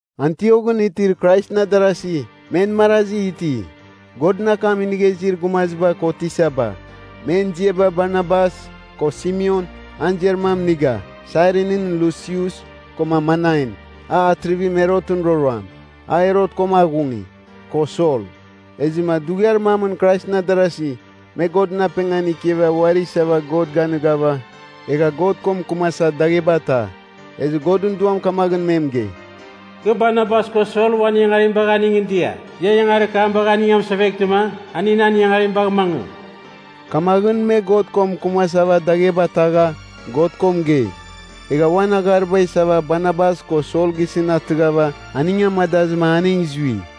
Antioghɨn itir Kraisɨn adarasi, men marazi iti, Godɨn akam inigha izir gumaziba ko tisaba. Men ziaba Barnabas, ko Simeon (an ziar mam Niger,) Sairinɨn Lusius, koma Manain (a Atrivim Herotɨn roroam, a Herot koma aghungi) ko Sol. Ezɨma dughiar mamɨn Kraisɨn adarasi, me Godɨn apengan ikiava uari isava God ganighava, egha God ko mɨkɨmasa dagheba ta. Ezɨ Godɨn Duam kamaghɨn me mɨgei, “Kɨ Barnabas ko Sol uan ingangarim bagha aningɨn dia. Ia ingangarir kam bagh aning amɨseveghtɨma, aning nan ingangarim bagh mangɨ.” Kamaghɨn me God ko mɨkɨmasava dagheba tagha, God ko mɨgei. Egha uan aghariba isava Barnabas ko Sol gisɨn atɨghava, aning amadazɨma aning zui.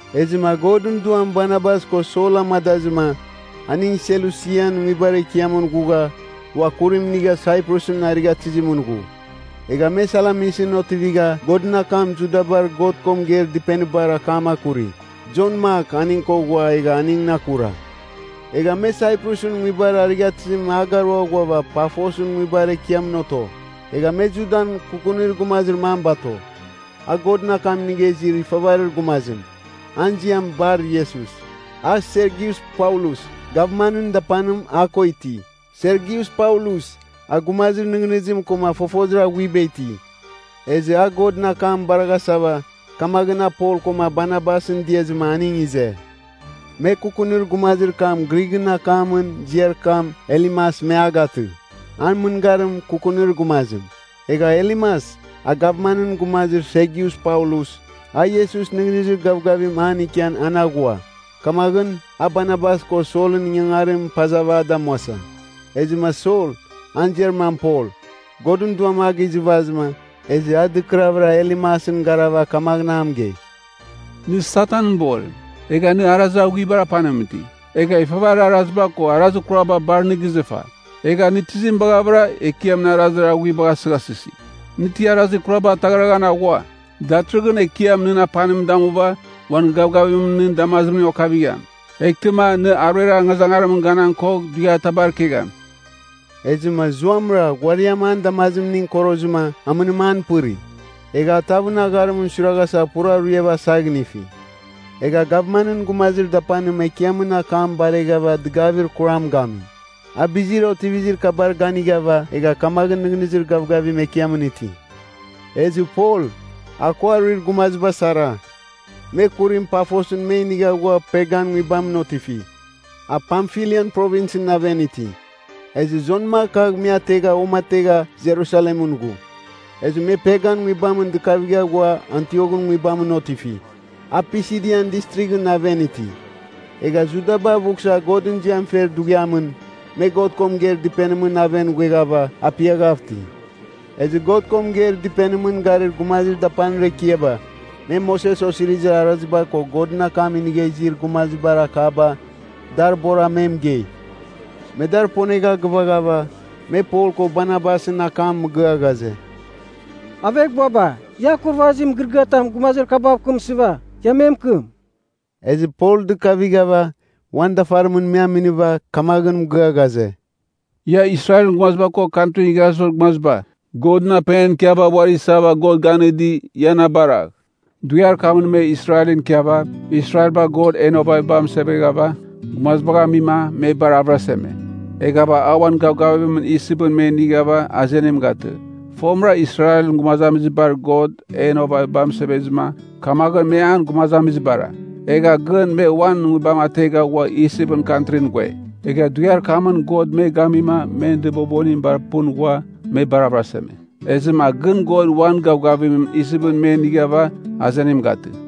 Ezɨma Godɨn Duam Barnabas ko Sol amadazɨma, aning Selusian nguibar ekiamɨn ghugha, ua kurim inigha Saiprusɨn arighatɨzimɨn ghu. Egha me Salamisɨn otivigha Godɨn akam Judabar God ko mɨgeir dɨpenibar akam akuri. Jon Mak aning ko ghua egha aningɨn akura. Egha me Saiprusɨn nguibar arighatɨzim a garua ghuava Pafosɨn nguibar ekiamɨn oto. Egha me Judan kukunir gumazir mam bato. A Godɨn akam inigha izir ifavarir gumazim, an ziam Bar-Iesus. A Sergius Paulus, gavmanɨn dapanim a ko iti. Sergius Paulus, a gumazir nɨghnɨzim koma fofozir aghuiba iti. Ezɨ a Godɨn akam baraghasava, kamaghɨn a Pol koma Barnabasɨn diazɨma aning ize. Me kukunir gumazir kam Grighɨn akamɨn ziar kam Elimas me a gatɨ, an mɨngarim kukunir gumazim. Egha Elimas, a gavmanɨn gumazim Sergius Paulus, a Iesus nɨghnɨzir gavgavim an ikian an aghua. Kamaghɨn, a Barnabas ko Solɨn ingangarim pazɨva a damuasa. Ezɨma Sol, an ziar mam Pol, Godɨn Duam a gizɨvazɨma, ezɨ a dɨkɨravɨra Elimasɨn garava kamaghɨn mɨgei, “Nɨ Satanɨn borim. Egha nɨ arazir aghuaribar apanimɨn iti. Egha ifavarir araziba ko arazir kuraba bar nɨ gizɨfa. Egha nɨ tizim baghavɨra Ekiamɨn arazir aghuibagh asɨghasɨsi? Nɨ ti arazir kuraba ataghraghan aghua? Datɨrɨghɨn Ekiam nɨn apanim damuva uan gavgavimɨn nɨn damazimning okavigham. Eghtɨma, nɨ aruer angazangarimɨn ganan kogh dughiatabar ikegham.” Ezɨma zuamɨra ghuariam an damazimning korozɨma amɨnim an pɨri. Egha a tavɨn agharimɨn suiraghasa pura ruiava asaghinifi. Egha gavmanɨn gumazir dapanim Ekiamɨn akam bareghava dɨgavir kuram gami. A bizir otivizir kabar ganighava egha kamaghɨn nɨghnɨzir gavgavim Ekiamɨn iti. Ezɨ Pol, a ko aruir gumaziba sara, me kurim Pafosɨn me inigha ghua Pergan nguibamɨn otifi. A Pamfilian Provinsɨn aven iti. Ezɨ Jon Mak kagh me ategha uamategha Jerusalemɨn ghu. Ezɨ me Pergan nguibamɨn dɨkavigha ghua Antioghɨn nguibamɨn otifi, a Pisidian Distrighɨn aven iti. Egha, Judaba avughsa Godɨn ziam fer dughiamɨn, me God ko mɨgeir dɨpenimɨn aven ghueghava apiaghav iti. Ezɨ God ko mɨgeir dɨpenimɨn garir gumazir dapanir ekiaba, me Moses Osirizir Araziba ko Godɨn akam inigha izir gumazibar akaba dar bora me mɨgei. Me dar ponegha gɨvaghava, me Pol ko Barnabasɨn akam mɨgɨa ghaze, “Aveghbuaba, ia akurvazir mɨgɨrɨgɨatam gumazir kabav mɨkɨmsɨva, ia me mɨkɨm.” Ezɨ Pol dɨkavighava, uan dafarimɨn me aminiva, kamaghɨn mɨgɨa ghaze, “Ia Israelɨn gumaziba ko Kantrin Igharazibar Gumaziba, Godɨn apengan ikiava uari isava God ganɨdi, ia na baragh! Dughiar kamɨn me Israelɨn ikiava, Israelbar God en ovaviba amɨseveghava, gumazibagh amim me bar avɨraseme. Eghava a uan gavgavimɨn Isipɨn me inighava azenim gatɨ. Fomɨra Israelɨn gumazamizibar God en ovaviba amɨsevezɨma, kamaghɨn me an gumazamizibara. Egha gɨn me uan nguibam ategha ghua Isipɨn kantrin ghue. Egha dughiar kamɨn God me gamima men dɨbobonim bar pɨn ghua, me bar avɨraseme. Ezɨma gɨn God uan gavgavimɨn Isipɨn me inighava azenim gatɨ.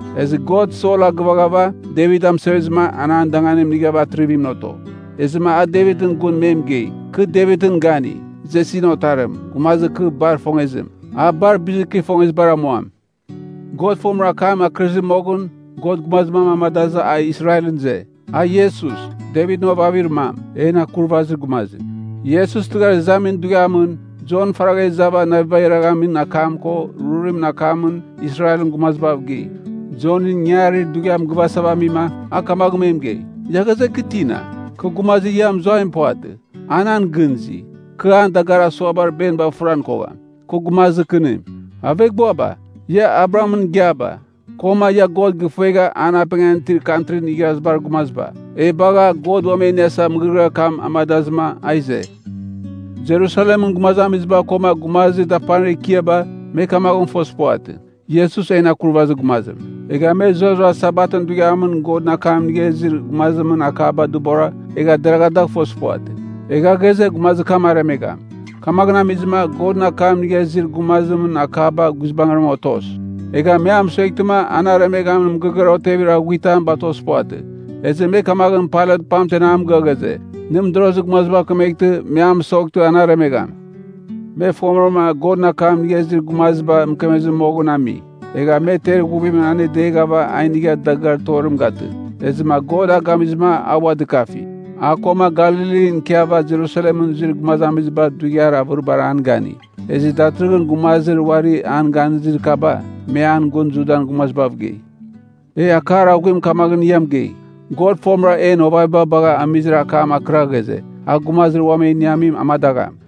Ezɨ God Sol agɨvaghava, Devit amɨsevezɨma an an danganim inighava atrivimɨn oto. Ezɨma a Devitɨn gun me mɨgei, ‘Kɨ Devitɨn gani, Jesin otarim, gumazir kɨ bar ifongezim, a bar bizir kɨ ifongezibar amuam.’ “God fomɨra akam akɨrɨzir moghɨn, God gumazir mam amadazɨ a Israelɨn ize. A Iesus, Devitɨn ovavir mam, en Akurvazir Gumazim. “Iesus tɨghar izamin dughiamɨn, Jon faragha izava navibagh iraghamin akam ko rurumɨn akamɨn Israelɨn gumazibav gei. Jonɨn ingangarir dughiam gɨvasava amima, a kamaghɨn me mɨgei, ‘Ia ghaze, kɨ tina? Kɨ gumazir ia mɨzuaim puvatɨ. A nan gɨn izi. Kɨ an dagarir asuabar beniba fɨran kogham. Kɨ gumazir kɨnim.’ “Aveghbuaba, ia Abrahamɨn igiaba, koma ia God gɨfuegha an apengan itir Kantrin Igharazibar Gumaziba, e bagha, God uam e iniasava mɨgɨrɨgɨar kam amadazɨma a ize. Jerusalemɨn gumazamiziba koma gumazir dapanir ekiaba, me kamaghɨn fozir puvatɨ, Iesus en Akurvazir Gumazim. Egha me zurara Sabatɨn dughiamɨn Godɨn akam inigha izir gumazimɨn akaba dɨbora, egha deragha dagh fozir puvatɨ. Egha ghaze gumazir kam aremegham. Kamaghɨn amizɨma, Godɨn akam inigha izir gumazimɨn akaba guizbangɨra otos. Egha me a mɨsueghtɨma an aremeghan mɨgɨrɨgɨar otevir aghuitam batozir puvatɨ. Ezɨ me kamaghɨn Pailat pamten a mɨgɨa ghaze, nɨ mɨdorozir gumazibav kemeghtɨ me a mɨsoghtɨ an aremegham. Me fomɨrama Godɨn akam inigha izir gumaziba mɨkemezɨ moghɨn ami. Egha me ter ighuvimɨn anedeghava a inigha dagɨar torim gatɨ. Ezɨma God a gamizɨma a ua dɨkafi. A koma Galilin ikiava Jerusalemɨn zuir gumazamiziba dughiar avɨribar an gani. Ezɨ datɨrɨghɨn gumazir uari an ganizir kaba, me an gun Judan gumazamizibav gei. “E akar aghuim kamaghɨn ia mɨgei. God fomɨra en ovaviba bagha amizir akam akɨra ghaze, a gumazir uam e iniamim amadagham.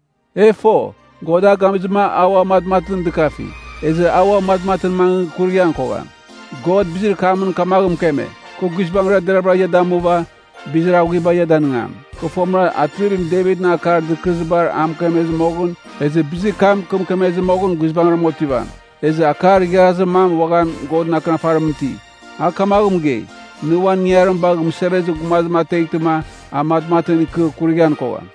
E fo, God a gamizɨma a ua matmatɨn dɨkafi. Ezɨ a ua matmatɨn mangɨ kurighan kogham. God bizir kamɨn kamaghɨn mɨkeme, ‘Kɨ guizbangɨra deraghvɨra ia damuva, bizir aghuiba ia danɨngam, kɨ fomɨra Atrivim Devit akar dɨkɨrɨzibar a mɨkemezɨ moghɨn. Ezɨ bizir kam kɨ mɨkemezɨ moghɨn guizbangɨram otivam.’ Ezɨ akar igharazir mam uaghan Godɨn Akɨnafarimɨn iti. A kamaghɨn mɨgei, ‘Nɨ uan ingangarim bagha mɨsevezir gumazim ateghtɨma, a matmatɨn ikɨ kurighan kogham.’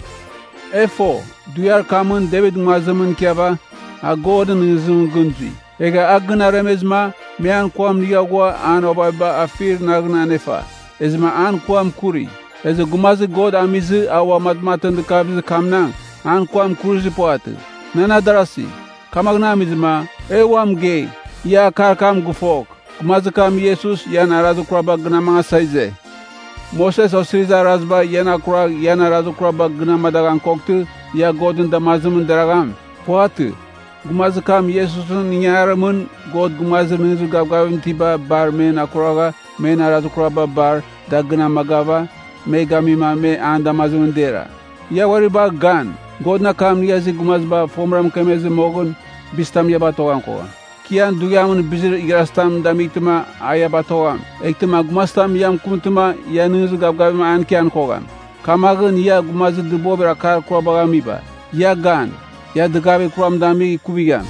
“E fo, dughiar kamɨn Devit nguazimɨn ikiava, a Godɨn nɨghnɨzimɨn gɨn zui. Egha a gɨn aremezɨma, me an kuam inigha ghua an ovaviba afir naghɨn anefa. Ezɨma an kuam kuri. Ezɨ gumazir God amizɨ a ua matmatɨn dɨkavizir kamnang, an kuam kurizir puvatɨ. Nan adarasi, kamaghɨn amizɨma, e ua mɨgei, ia akar kam gɨfogh, gumazir kam Iesus ian arazir kuraba gɨn amangasa ize. Moses Osirizir Araziba ian akuragh ian arazir kuraba gɨn amadaghan koghtɨ, ia Godɨn damazimɨn deragham. Puvatɨ. Gumazir kam Iesusɨn ingangarimɨn, God gumazir nɨghnɨzir gavgaviba itiba bar, men akuragha men arazir kuraba bar, da gɨn amagava, me gamima me an damazimɨn dera. Ia uari bagha gan, Godɨn akam inigha izir gumaziba fomɨra mɨkemezir moghɨn, bizitam ia batoghan kogham: ‘Kɨ ian dughiamɨn bizir igharazitam damightɨma a ia batogham. Eghtɨma gumazitam ia mɨkɨmtɨma ia nɨghnɨzir gavgavim an ikian kogham. Kamaghɨn, ia gumazir dɨbovir akar kurabagh amiba, ia gan, ia dɨgavir kuram damigh ikuvigham.’”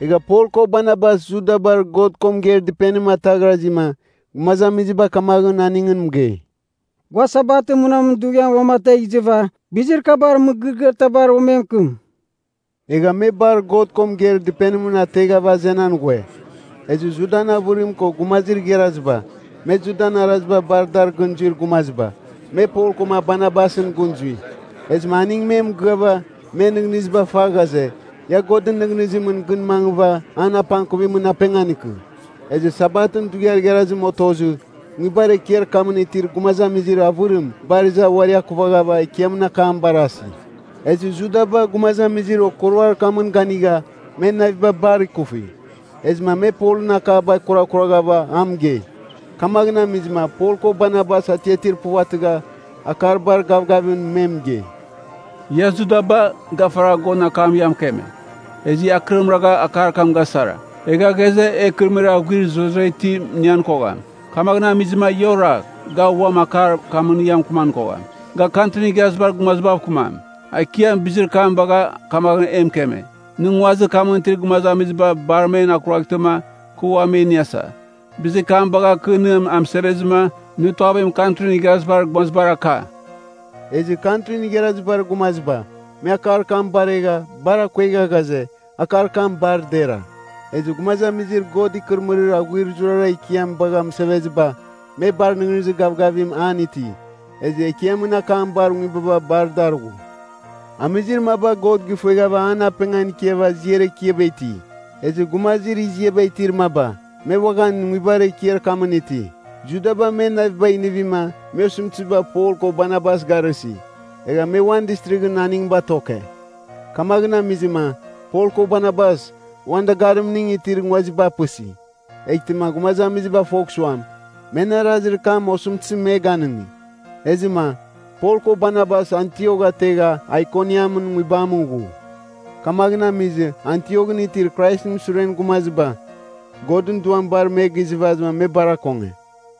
Egha Pol ko Barnabas Judabar God ko mɨgeir dɨpenim ataghrazima, gumazamiziba kamaghɨn aningɨn mɨgei, “Gua Sabatɨn munamɨn dughiamɨn uamategh izɨva bizir kabar mɨgɨrɨgɨar tabar uam e mɨkɨm.” Egha me bar God ko mɨgeir dɨpenim ateghava azenan ghue. Ezɨ Judan avɨrim ko gumazir igharaziba, me Judan araziba bar dar gɨn zuir gumaziba, me Pol koma Barnabasɨn gɨn zui. Ezɨma aning me mɨgɨava, men nɨghnɨziba fa ghaze, ia Godɨn nɨghnɨzimɨn gɨn mangɨva an apangkuvimɨn apengan ikɨ. Ezɨ Sabatɨn dughiar igharazim otozɨ, nguibar ekiar kamɨn itir gumazamizir avɨrim bar iza uari akuvaghava Ekiamɨn akam barasi. Ezɨ Judaba gumazamizir okuruar kamɨn ganigha, men naviba bar ikufi. Ezɨma me Polɨn akaba kurakuraghava a mɨgei. Kamaghɨn amizɨma Pol ko Barnabas atiatir puvatɨgha, akar bar gavgavimɨn me mɨgei, “Ia Judaba, ga faragha Godɨn akamɨn ia mɨkeme. Ezɨ ia akɨrim ragha akar kam gasara. Egha ghaze, e ikɨrɨmɨrir aghuir zurara itim inian kogham. Kamaghɨn amizɨma, ia oragh, ga uam akar kamɨn ia mɨkɨman kogham. Ga Kantrin Igharazibar Gumazibav kɨmam. Ekiam bizir kam bagha kamaghɨn e mɨkeme: ‘Nɨ nguazir kamɨn itir gumazamiziba bar men akuraghtɨma kɨ ua me iniasa, bizir kam bagh, kɨ nɨ amɨsevezɨma, nɨ tuavim Kantrin Igharazibar Gumazibar aka.’” Ezɨ Kantrin Igharazibar Gumaziba, me akar kam baregha, bar akuegha ghaze, akar kam bar dera. Ezɨ gumazamizir God ikɨrɨmɨrir aghuir zurara ikiam bagha mɨseveziba, me bar nɨghnɨzir gavgavim an iti. Ezɨ Ekiamɨn akam bar nguibaba bar dar ghu. Amizir maba God gifueghava an apengan ikiava ziar ekiaba iti, ezɨ gumazir iziaba itir maba, me uaghan nguibar ekiar kamɨn iti. Judaba men navibagh inivima, me osɨmtɨziba Pol ko Barnabas garɨsi. Egha me uan distrighɨn aning batoke. Kamaghɨn amizɨma, Pol ko Barnabas, uan dagarimningɨn itir nguaziba apɨsi, eghtɨma gumazamiziba fogh suam, men arazir kam osɨmtɨzim me ganɨngi. Ezɨma, Pol ko Barnabas Antiok ategha Aikoniam nguibamɨn ghu. Kamaghɨn amizɨ Antioghɨn itir Kraisɨn suren gumaziba, Godɨn Duam bar me gizɨvazɨma me bar akonge.